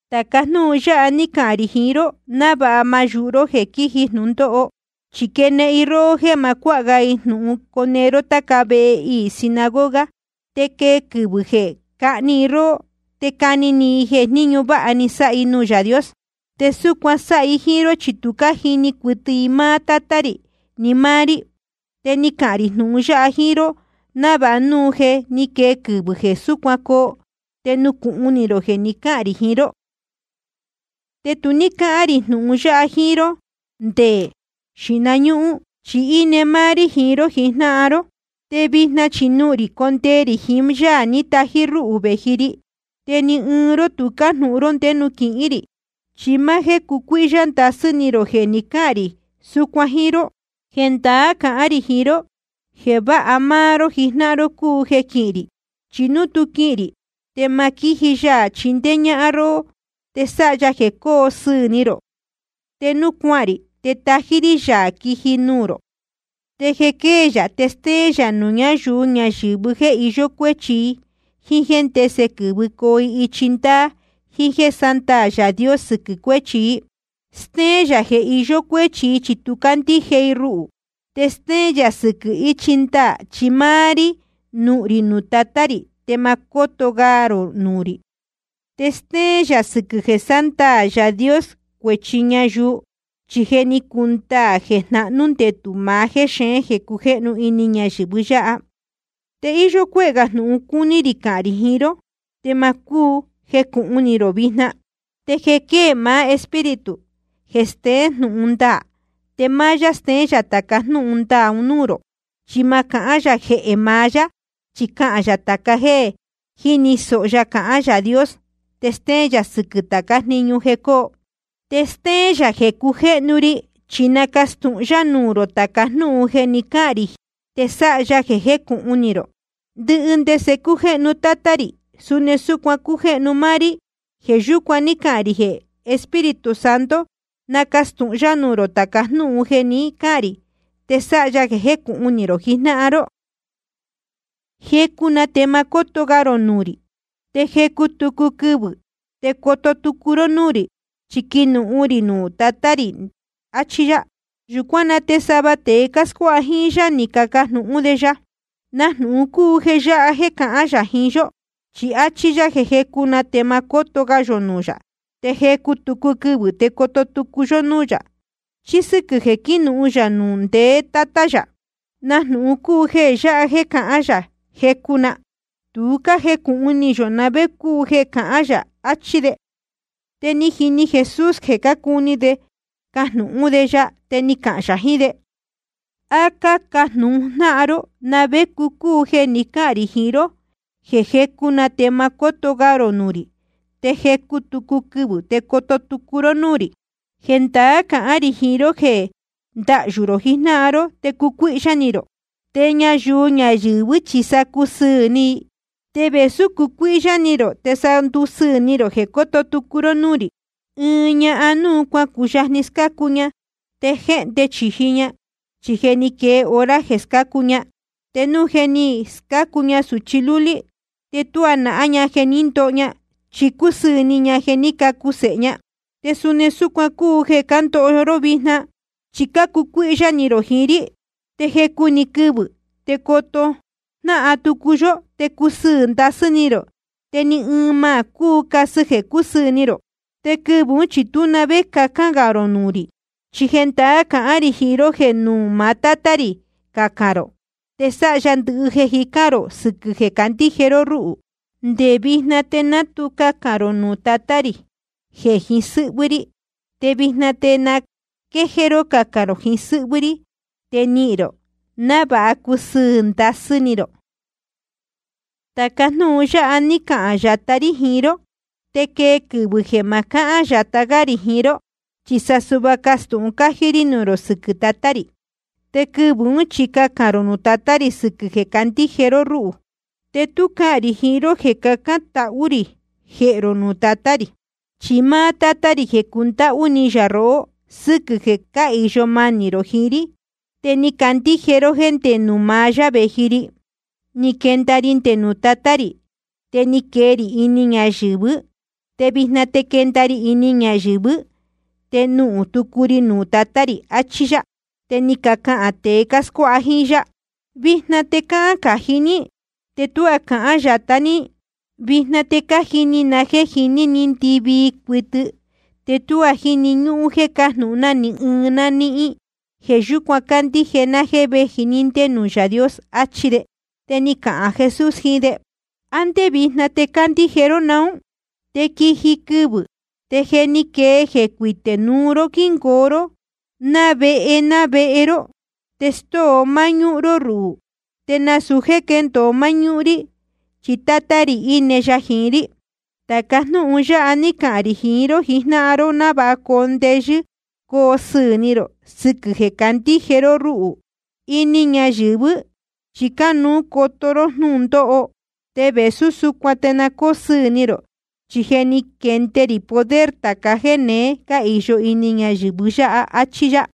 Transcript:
’Tāca jnúhun yáha ní cahān rī jiín ró návāha ma náyūhu ró jeē quíji jnūndóho. Chi quenehen i róhó jéē ma cuáha ga i jnūhun cone ró táca vehe iī sinagoga. Te quee quɨvɨ̄ jeē cahni i róhó, te cani ni i jeē ɨɨn jniñu váha ni sáha i nuū Yaā Dios. Te súcuan sáha i jíín ró, chi tu cájini cuɨtɨ i máá Tátá rī ni máá rí. Te ni cahān rī jnūhun yáha jíín ró návāha núu je ni quee quɨvɨ̄ jeē súcuan coo, te nucūhun ni rō jeē jé ni cahān rī jiín ró. ’Te tu ní cáhán rī jnūhun yáha jíín ró nde xīhna ñúhún, chi íne máá rí jiín ró jijnáhan ró. Te vijna chi nuhūn rī condee rī jiín Yaā ní tají rúhū vēji ri. Te ni ɨɨn ró tu cájnūhun ró ndé nuū quihín rī. Chi máá jéē cácucuíhyá ndasɨ́ ni rō jeē ni cáhān rī súcuan jíín ró. Jendaá cahán rī jiín ró: Jeē váha máá ró jijnáhan ró cúu jeē quihín rī. Chi núu tú quihīn rī, te ma quíji Yaā chindéé ñáhán róhó te sáha ya jeē cóo sɨɨ̄ ni rō. Te núu cuahān rī, te tají rí yā quiji ya nuū rō. Te jeē quée yā, te stéén yā nuū ñáyuu ñayɨ̄vɨ jéē iyó cuéchi i, jíín ndese quɨ̄vɨcoo i ichi ndaā, jiín jéē sándaā Yaā Dios sɨquɨ̄ cuéchi i. Stéén yā jeē iyó cuéchi i, chi tu cácandíje i ruhū. Te stéén yā sɨquɨ̄ ichi ndaā, chi máá rí nuhūn rī nuū Tatá rī, te ma cóto ga rō nuū rī. Te stéén yā sɨquɨ̄ jeē sándaā Yaā Dios cuēchi ñayuu, chi je ni cundaā jeē jnahnú ndetū maá jéxeén jeē cujéhnu ini ñayɨ̄vɨ yáha. ’Te íyó cuéhē gā jnūhun cúní rī cahān rī jiín ró, te ma cúu jecūhun ni rō vijna. Te jeē quée maá Espíritu jeē steén jnūhun ndaā, te máá yá steén tāca jnúhun ndaā un núū rō. Chi ma cahán yā jeē maá yá, chi cahān yā tāca jéē jíni sōho ya cahán Yaā Dios. Te stéén yā sɨquɨ̄ tācá jniñu jeē coo. Te stéén yā jeē cujéhnu ri, chi nacastūhun yá nuū rō tāca jnúhun jeē jé ni cahān rī, te sáha ya jeē jécūhun ni rō. Ndɨhɨ ndese cújéhnu Tátá rī, suni súcuan cújéhnu máá rí. Jeē yúcuan ní cahān rī jeē Espíritu Santo nacastūhun yá nuū rō tāca jnúhun jeē jé ni cahān rī, te sáha ya jeē jécūhun ni rō jijnáhan ró. ’Jecu na te ma cóto ga rō nuū rī. Te jecu tucu quɨvɨ̄ te coto tucu ró núū rī, chi quinuhun rī nuū ndeé Tátá rī. Achí yá. Yūcuán na te sava tēe cáscuáha jíín yá, ni cacajnūhun jnáhan de: ¿Na jnūhun cúu jeē yáha jeē cahán yā jiín yó? Chi áchí yá jeē jecu na te ma cóto ga yō nuū yā, te jecu tucu quɨvɨ̄ te coto tucu yó núū yā, chi sɨquɨ̄ jeē quínuhun yā nuū ndeé Tátá yā. ¿Na jnūhun cúu jeē yáha jeē cahán yā, jecu na? Tu cájecūhun ni yō na vé cúu jeē cahán yā. Achí de. Te ni jini Jesús jeē cácuni de cajnūhún de ya. Te ni cahān yā jiín de: ¿A cácajnūhun jnáhan ró na vé cúu jeē ni cáhān rī jiín ró jeē jecu na te ma cóto ga rō nuū rī, te jecu tucu quɨvɨ̄ te coto tucu ró núū rī? Jendaá cahán rī jiín ró jeē ndahyū rō jijnáhan ró te cucuíhyá ni rō, te ñayuu ñayɨ̄vɨ́ chi sa cusɨɨ̄ ni i. Te vēsú cucuíhyá ni rō, te sa ndusɨɨ̄ ni rō jeē cóto tucu ró núū rī. Ɨɨn ñahan núu cuacuyajni scácu ña, te jéhnde chīji ña, chi je ni quee hora jeē scácu ña. Te núu je ni scácu ña sūchi lúlí, te tuá nahán ña jeē ní ndoho ña, chi cúsɨɨ̄ ni ña jeē ní cacu sēhe ña. Te suni súcuan cúu jeē cándoho ró vijna, chi cácucuíhyá ni rō jiín rí. Te jecu‑ni quɨvɨ̄ te coto jnáhan tucu yó, te cusɨɨ̄ ndasɨ́ ni rō. Te ni ɨɨn ma cúu casɨ jeē cúsɨɨ̄ ni rō. ’Te quɨvɨ̄ ún chi tú na vé cacān gā rō nuū rī. Chi jendaá cahán rī jiín ró jeē nuū maá Tátá rī cacān rō, te sáha ya ndɨhɨ jeē cájicān rō, sɨquɨ̄ jeē cácandíje ró rúhū. Nde vijna te ná tu cacān rō nuū Tatá rī jeē jiín sɨ́hvɨ́ rí. Te vijna te na quéjéé ró cacān rō jiín sɨ́hvɨ́ rí, te nihīn rō, návāha cusɨɨ̄ ndasɨ́ ni rō. ’Tāca jnúhun yáha ní cahān yatá rí jiín ró. Te quee quɨvɨ̄ jeē ma cahán yatá gá rī jiín ró, chi sa suhva castūhun cájí rí nuū rō sɨquɨ̄ Tatá rī. Te quɨvɨ̄ ún chi cacān rō nuū Tatá rī sɨquɨ̄ jeē cácandíje ró rúhū. Te tu cáhán rī jiín ró jeē cacán tahú rī jehē rō nuū Tatá rī. Chi máá Tátá rī je cúndáhú ni yā rohó sɨquɨ̄ jeē cáhīyo manī rō jiín rí, te ni cacandíje ró jéē ndé nuū maá yá vēji ri. Ni quenda ri nde nuū Tatá rī, te ni quee rī ini ñayɨ̄vɨ́. Te vijna te quenda ri ini ñayɨ̄vɨ́, te nuhūn tucu ri nuū Tatá rī. Achí yá. Te ni cacahān tēe cáscuáha jíín yá: Vijna te cáhán cají ní, te tuá cahán yatá ní. Vijna te cájini na jéē jiní ni ndɨvii cuɨtɨ, te tuá jíni ñúhún jéē cájnūhún ni ɨɨn ná níhín. Jeē yúcuan cácandíje ná jéē véji ní ndé nuū Yaā Dios. Achí de. Te ni cahān Jesús jiín de: ¿A ndé vijna te cácandíje ró naún? Te quiji quɨvɨ̄, te je ni quee, jeē cuité núu ró quínungoo ró ná vehe ná vehe ró, te stóo máñúhún ró ruhū. Te nasūu jéē quéndōo máñúhún rí, chi Tátá rī íne ya jiín rí. Tāca jnúhun yáha ní cahān rī jiín ró návāha coo ndeyɨ́ coo sɨɨ̄ ni rō sɨquɨ̄ jeē cácandíje ró rúhū. Ini ñayɨ̄vɨ́ chi cánuú coto ró jnúndóho. Te vēsú súcuan te na cóo sɨɨ̄ ni rō, chi je ni quende rī poder tāca jéneé cáhīyo ini ñayɨ̄vɨ́. Achí yá.